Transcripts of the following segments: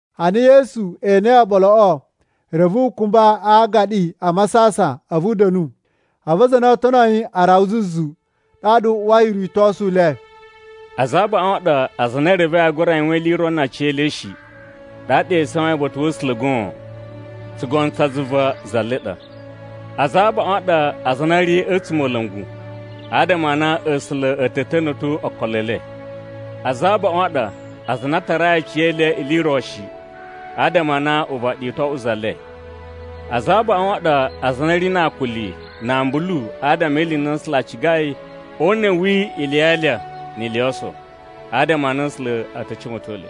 Ana Yesu enei oɓoloꞌo, reve u kumba a aagaɗi a masasan a̱vu u da̱nu. A̱vu aza a na oo tono yi a rawa zuzu, ɗaɗa u uwai o ritosu le. “Aza a abaꞌun a ɗa aza a na e revei aa gura yuwan ili i ro na aciyele shi, ɗaɗa e isawain uba̱ta̱ wa̱ A̱sula̱ goon. Tsugono tsa zuva za le ɗa! Aza a abaꞌun a ɗa aza a na a̱ ri a̱ a̱tsumola̱ngu, adama a na A̱sula̱ a̱ ta̱ ta̱na̱to okolo e le. Aza a abaꞌun a ɗa aza a na a tarai aciyele ili i ro shi, adama a na uvaɗi u to oꞌwo za le. Aza a abaꞌun a ɗa aza a na a̱ ri na akuli na ambulu adama e ili i na A̱sula̱ a cigai o una̱ wi ili ya alya ni ili yo oso, adama a na A̱sula̱ a̱ ta̱ cuwa̱ton le.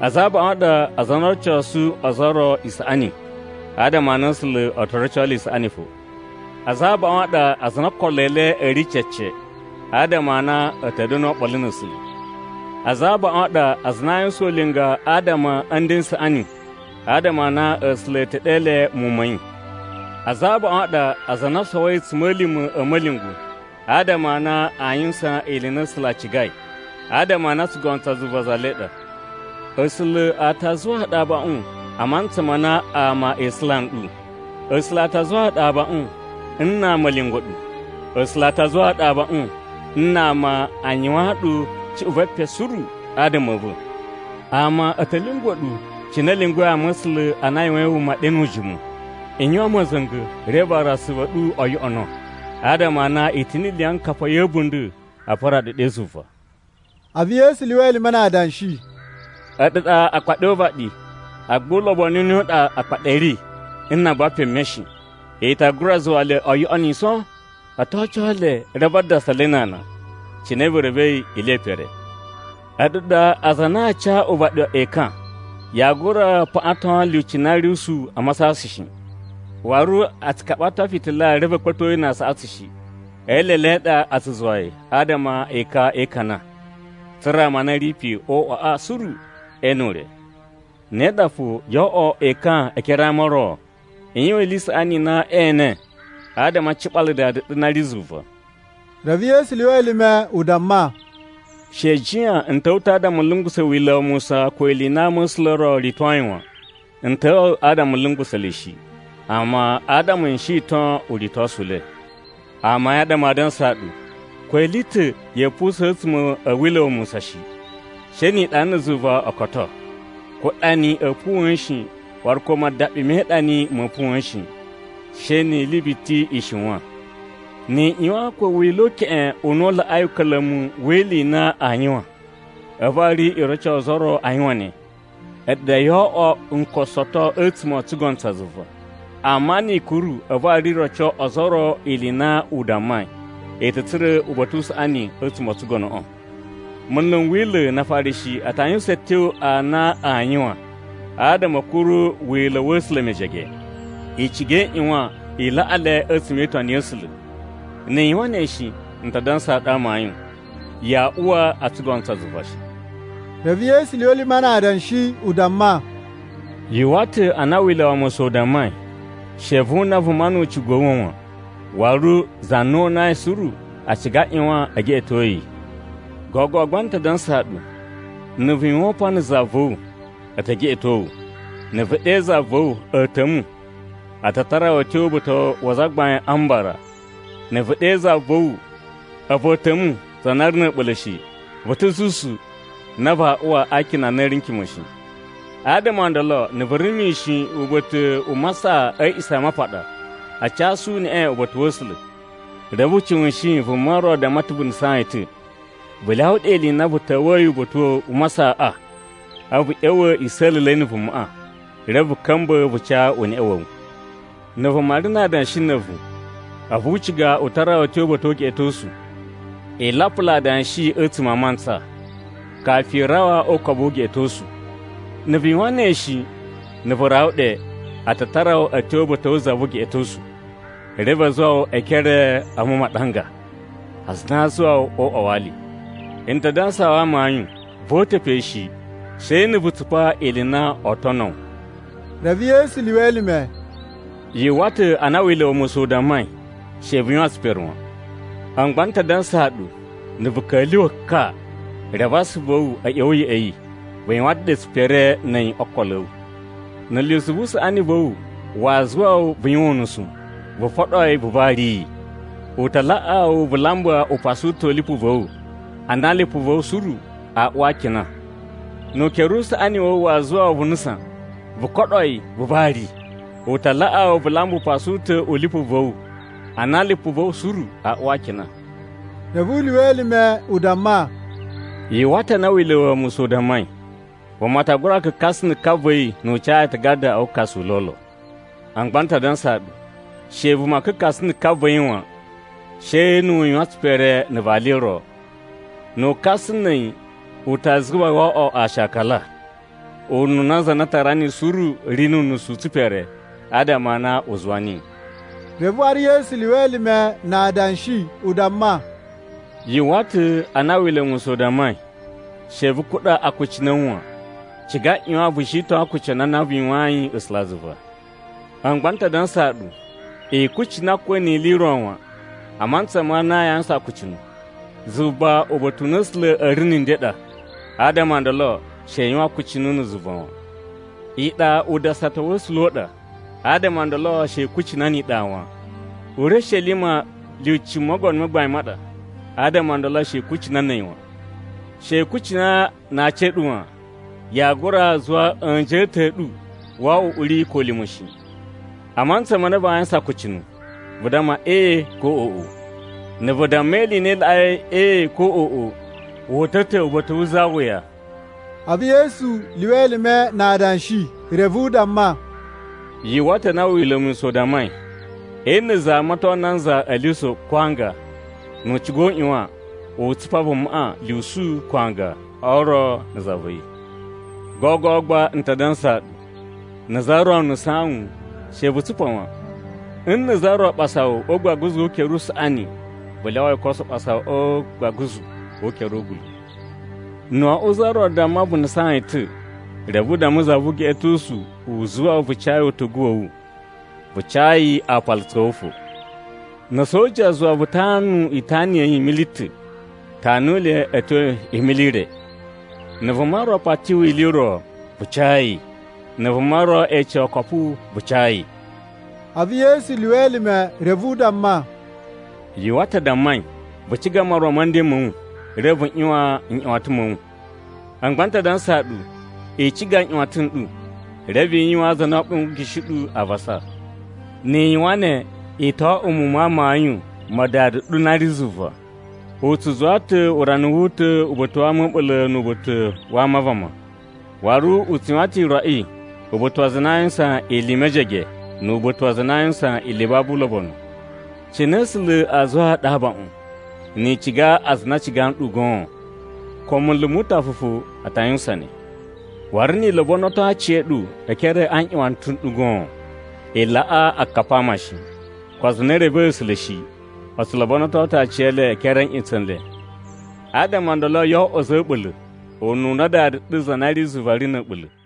Aza a abaꞌun a ɗa aza a na oo rocosu ozo o ro isaꞌani, adama a na A̱sula̱ o to roco le isaꞌani fo. Aza a abaꞌun a ɗa aza a na okolo e le a̱ ri cece, adama a na a̱ ta̱ da̱nu oɓolo na̱ A̱sula̱. Aza a abaꞌun a ɗa aza a na aa yuwusan ulinga adama a̱ nden n saꞌani, adama a na A̱sula̱ a̱ ta̱ ɗe le muwun ma̱ yi. Aza a abaꞌun a ɗa aza a na o sowoi a̱tsuma̱lima̱ a̱ ma̱lyungwa̱, adama a na aa yuwusan ili i na A̱sula̱ a cigai, adama a na tsugono tsa zuva za le ɗa. “A̱sula̱ a ta zuwaa ɗu abaꞌun a mantsa ma na ama e isula nɗu. A̱sula̱ a ta zuwaa ɗu abaꞌun nna ama a̱ lyungwa̱ ɗu. A̱sula̱ a ta zuwaa ɗu abaꞌun nna ama a yuwaan ɗu cuꞌun ve epen suru adama a̱ va̱. Ama a̱ ta̱ lyungwa̱ ɗu cine a̱ lyungwa̱i ama̱sula̱ a na a yuwain wuma ɗe nu ujimu. I yuwan ma̱za̱nga̱, reve waru asuvu a̱ ɗu o yoꞌono, adama a na i ta̱ ni iliyinkapa ya̱ a̱bunda̱ a pura ɗu ɗe zuva.” A̱vu Yesu lyuwa elime na adanshi, “A̱ɗu ɗa akpaɗi o uvaɗi. Agba ulobonu u ne u ɗa akpaɗi a̱ ri nna a buwa peme shi? I ta gura zuwa le u yoꞌoniso? O to oco le reve a dasa le na ana, cine vu revei ili ye pere. “A̱ɗu ɗa aza a na aa casu uvaɗi ekan. Yaa gura paꞌaton lyuci na ri usuwu a masasan shi. Waru a tsu kaɓato fitila reve a̱ kpa̱to yi na aasaꞌatsu shi. E eelele a ɗa a̱ tsu zuwa yi adama ekan e ikana, tsa̱ra̱ ama a na a̱ ri pe o uꞌwaꞌa suru e ene ure. Ne ɗa fo, yo oꞌwo ekan e ekere a ama o ro. I yuwan ili i saꞌani i na ee ene adama a ciɓala Dada ɗu na ri zuva.” Reve Yesu lyuwa elime u damma, “She i jiyan n ta̱wa̱ ta̱ adama n lungusa̱ Wila̱ wa Musa ko ili i na ama̱sula̱ o ritoi wan. N ta̱wa̱ adama n lungusa̱ le shi, amma adama n shiton uritosu u le. Amayun a ɗa maa dansaa ɗu, ko ili i ta̱ ya̱a̱ pusa̱n a̱tsuma̱ a̱ Wila̱ꞌa̱ shi, she ni iɗa na̱ zuva o koto. Ko ɗani a̱a̱ puwa̱n shi waru ko madaɓi me iɗani ma̱a̱ puwa̱n shi, she ni ili biti i shiwan. Ni i ꞌyuwan ko Wila̱ u keꞌen u na u laꞌai uka̱la̱mu wi ili i na aa yuwan, a̱vu waru i roco ozo o ro a yuwan ne, a̱ɗu ɗa yoo oꞌwo nkosoto a̱tsuma̱ o tsugono tsa zuva. Amma ni i kuru a̱vu waru i roco ozo o ro ili i na u dammai, i ta̱ tsura̱ uba̱ta̱ u saꞌani a̱tsuma̱ o tsugonoꞌo. “Munlu n Wila̱ na Afarishi a ta yuwusan a̱tyo a na aa yuwan adama a̱ kuru Wila̱ wa̱ A̱sula̱ mejege. I ciga i ꞌyuwan i laꞌa le a̱tsuma̱ e itoni ya̱ A̱sula̱. Ni i yuwan ne shi, n ta dansaa ɗu amayun, yaa uwa o tsugono tsa zuva shi.” Reve Yesu lyuwa elime na adanshi u damma, “Yu uwwa ta̱ a na Wila̱ wa Musa u dammai, ‘She vu una vuma nu ucigu wa̱ wu wan.’ Waru, ‘Za na unai suru a ciga a ꞌyuwan e geꞌeto yi.’ Gogo gba n ta dansaa ɗu: na̱ vu yuwan upan na̱ za va̱ wu, a̱ ta̱ geꞌeto wu. Na̱ vu ɗe za va̱ wu, ‘A̱a̱ta̱mu,’ a ta tara wu a̱ tyo uba̱ta̱ wa Azagbain a Mbara. Na̱ vu ɗe za va̱ wu, ‘A̱vu a̱a̱ta̱mu za na ri na̱ a̱ɓula̱ shi,’ vu ta̱ zuzu na vaa uwa a akina a na a̱ ri n kima̱ shi. “Adama o ndolo, na̱ vu ri mishin uba̱ta̱ u masaꞌa a̱ A̱a̱ꞌisamapaɗa a casu uneꞌe uba̱ta̱ wa̱ A̱sula̱, reve vu cuwushin vuma ro damma ta̱ vu nusaan yi ta̱, vu lyawa ɗe ili i na vu ta̱wa̱yi uba̱ta̱ u masaꞌaꞌa. A̱vu vu ꞌya̱wa̱ i sa̱la̱la̱i na̱ vumaꞌa, reve ka̱mba̱ vu ca uneꞌe wa̱ wu. “Na̱ vuma ri na adanshi na̱ a̱vu, a̱vu u ciga u tara wu a̱ tyo uba̱ta̱ o ugeꞌetosu, i lapula adanshi a̱tsuma̱ a mantsa, kafu i rawa o ukobu wu ugeꞌetosu. Na̱ vu yuwan ne shi, na̱ vu rawa ɗe, a ta tara wu a̱ tyo uba̱ta̱ wu za vu ugeꞌetosu. Reve u zuwa wu e ekere a̱ mumaɗanga, aza a na a zuwa wu o uꞌwa wa ali. N ta dansaa wu amayun, voo uta̱ pe shi, she na̱ vu tsupa ili i na oo tono wu.” Reve Yesu lyuwa elime, “Yu uwwa ta̱ a na Wila̱ wa Musa u dammai, ‘She vu yuwan tsipere wan.’ A̱mu gba n ta dansaa ɗu, na̱ vu ka̱lyuwa̱ ka, reve asuvu a̱ wu a̱ ꞌya̱wa̱ ya̱ꞌa̱ yi, vu yuwan ta̱ ɗe tsipere na̱ a̱yi o okolo a̱ wu. Na̱ lyusu vu usaꞌani va̱ wu waa zuwusa wu vu yuwan unusu, vu foɗo yi vu vari yi. U ta laꞌaa wu vu lamba upasu u ta̱ u lipu va̱ wu, a na lipu va̱ wu suru aa uwa a akina. Nu ukere usaꞌani wa̱ wu waa zuwusa wu vu nusan, vu koɗo yi vu vari! U ta laꞌaa wu vu lamba upasu u ta̱ u lipu va̱ wu a na lipu va̱ wu suru aa uwa a akina.” Reve u lyuwa elime u damma, “Yu uwwa ta̱ a na Wila̱ wa Musa u dammai, ‘Vuma ta gura kakasa na̱ ka va̱ yi nu u ca yi aatagada a wukasu u lolo.’ A̱mu gba n ta dansaa ɗu, she vuma kakasa na̱ ka va̱ yi wan, she nu u yuwan tsipere na̱ vali ro. Na̱ wu kasa na̱ a̱yi u ta zuwa yi wo oꞌwo aashakala, ununa za na tara niyi suru ri nu unusu u tsipere adama a na u zuwa niyi.” Reve waru Yesu lyuwa elime na adanshi u damma, “Yu uwwa ta̱ a na Wila̱ wa Musa u dammai, ‘She vu kuɗa akucunu a̱ wu wan. Ciga ꞌyuwan vu shiton akucunu a na vu yuwayin A̱sulazuva.’ A̱mu gba n ta dansaa ɗu, i kucina ko ni ili i ro wan, a mantsa ma na yaa yuwusan akucunu! Zuva uba̱ta̱ u na A̱sula̱ a̱ ri na̱ nden ɗa, adama o ndolo she i yuwan akucunu na̱ zuva wan. Iɗa udasata wa̱ A̱sula̱ u ɗa, adama o ndolo she i kucina ni iɗa wan. Urishelima lyuci Mogono ma Gbain ma ɗa, adama o ndolo she i kucina na̱ a̱yi wan. She i kucina na aci a̱ ɗu wan. Yaa gura zuwa a̱nji a̱ ta̱ a̱ ɗu wo oꞌwo uꞌuri ko ulima̱ shi. A mantsa ma na vaa yuwusan akucunu, vu damma ‘Ee’ ko ‘Oꞌo.’ Na̱ vu damma ili i na i laꞌai ‘Ee’ ko ‘Oꞌo,’ wu uta̱ ta̱ uba̱ta̱ wu za wuya.” A̱vu Yesu lyuwa elime na adanshi, reve u damma, “Yu uwwa ta̱ a na Wila̱ wa Musa u dammai, ‘Nna̱ za amaton nanza a̱ lyusu ko a aanga, nu u ciga u ꞌyuwan u tsupa vumaꞌa lyusu ko aanga o ro na̱ za va̱ yi.’ Gogo gba n ta dansaa ɗu: na̱ za ro nusaan wu, she vu tsupa wan. Nna̱ za ro ɓasa wu o ugbaguzu wu ukere usaꞌani vu lyawa yi u koso ɓasa wu o ugbaguzu wu ukere wu ugula̱. Na̱ wo oꞌwo za ro damma vu nusaan yi ta̱, reve u damma za vu ugeꞌetosu u zuwa wu vu ca yi utugu wa̱ wu, vu ca yi aapalutsu a̱ wu fo. Na̱ soja zuwa wu vu tanu itana ya̱ yi mili ta̱, tanu le a̱ tyo imili i re. Na̱ vuma ro pati wu ili i ro, vu ca yi. Na̱ vuma ro ece wu okopu, vu ca yi.” A̱vu Yesu lyuwa elime reve u damma, “Yu uwwa ta̱ a dammai, ‘Vu ciga moron ma̱ nden ma̱ wu, reve vu ꞌyuwan nꞌyuwatan ma̱ wu.’ A̱mu gba n ta dansaa ɗu, i ciga nꞌyuwatan n ɗu, reve i yuwaan aza a na oo ɓongishi ɗu avasa. Ni i yuwan ne, i to oꞌwo muwun ma amayun ma Dada ɗu na ri zuva. U tsu zuwa ta̱ urana wu uta̱ uba̱ta̱ wa ama a̱ a̱ɓula̱ nu uba̱ta̱ wa ama a vama. Waru u tsu yuwan ta̱ iroꞌi uba̱ta̱ wa aza a na aa yuwusan ili i na i ri mejege nu uba̱ta̱ wa aza a na aa yuwusan ili i babu ulobonu. Cine A̱sula̱ aa zuwaa ɗu abaꞌun, ni i ciga aza a na a ciga nɗu goon? Ko munlu mu utafa fo a ta yuwusan ne! Waru nni i lobonoto aciya̱ɗu e ekere a̱ nꞌutsa̱ n ɗu goon, i laꞌa akapi a ama shi. Ko aza a na e revei A̱sula̱ shi, o tsu lobonoto ta̱ aciyele e ekere a̱ nꞌutsa̱ n le. Adama o ndolo, yo oꞌwo a̱za̱ a̱ a̱ɓula̱, ununa Dada ɗu za na ri zuva ri na̱ a̱ɓula̱.”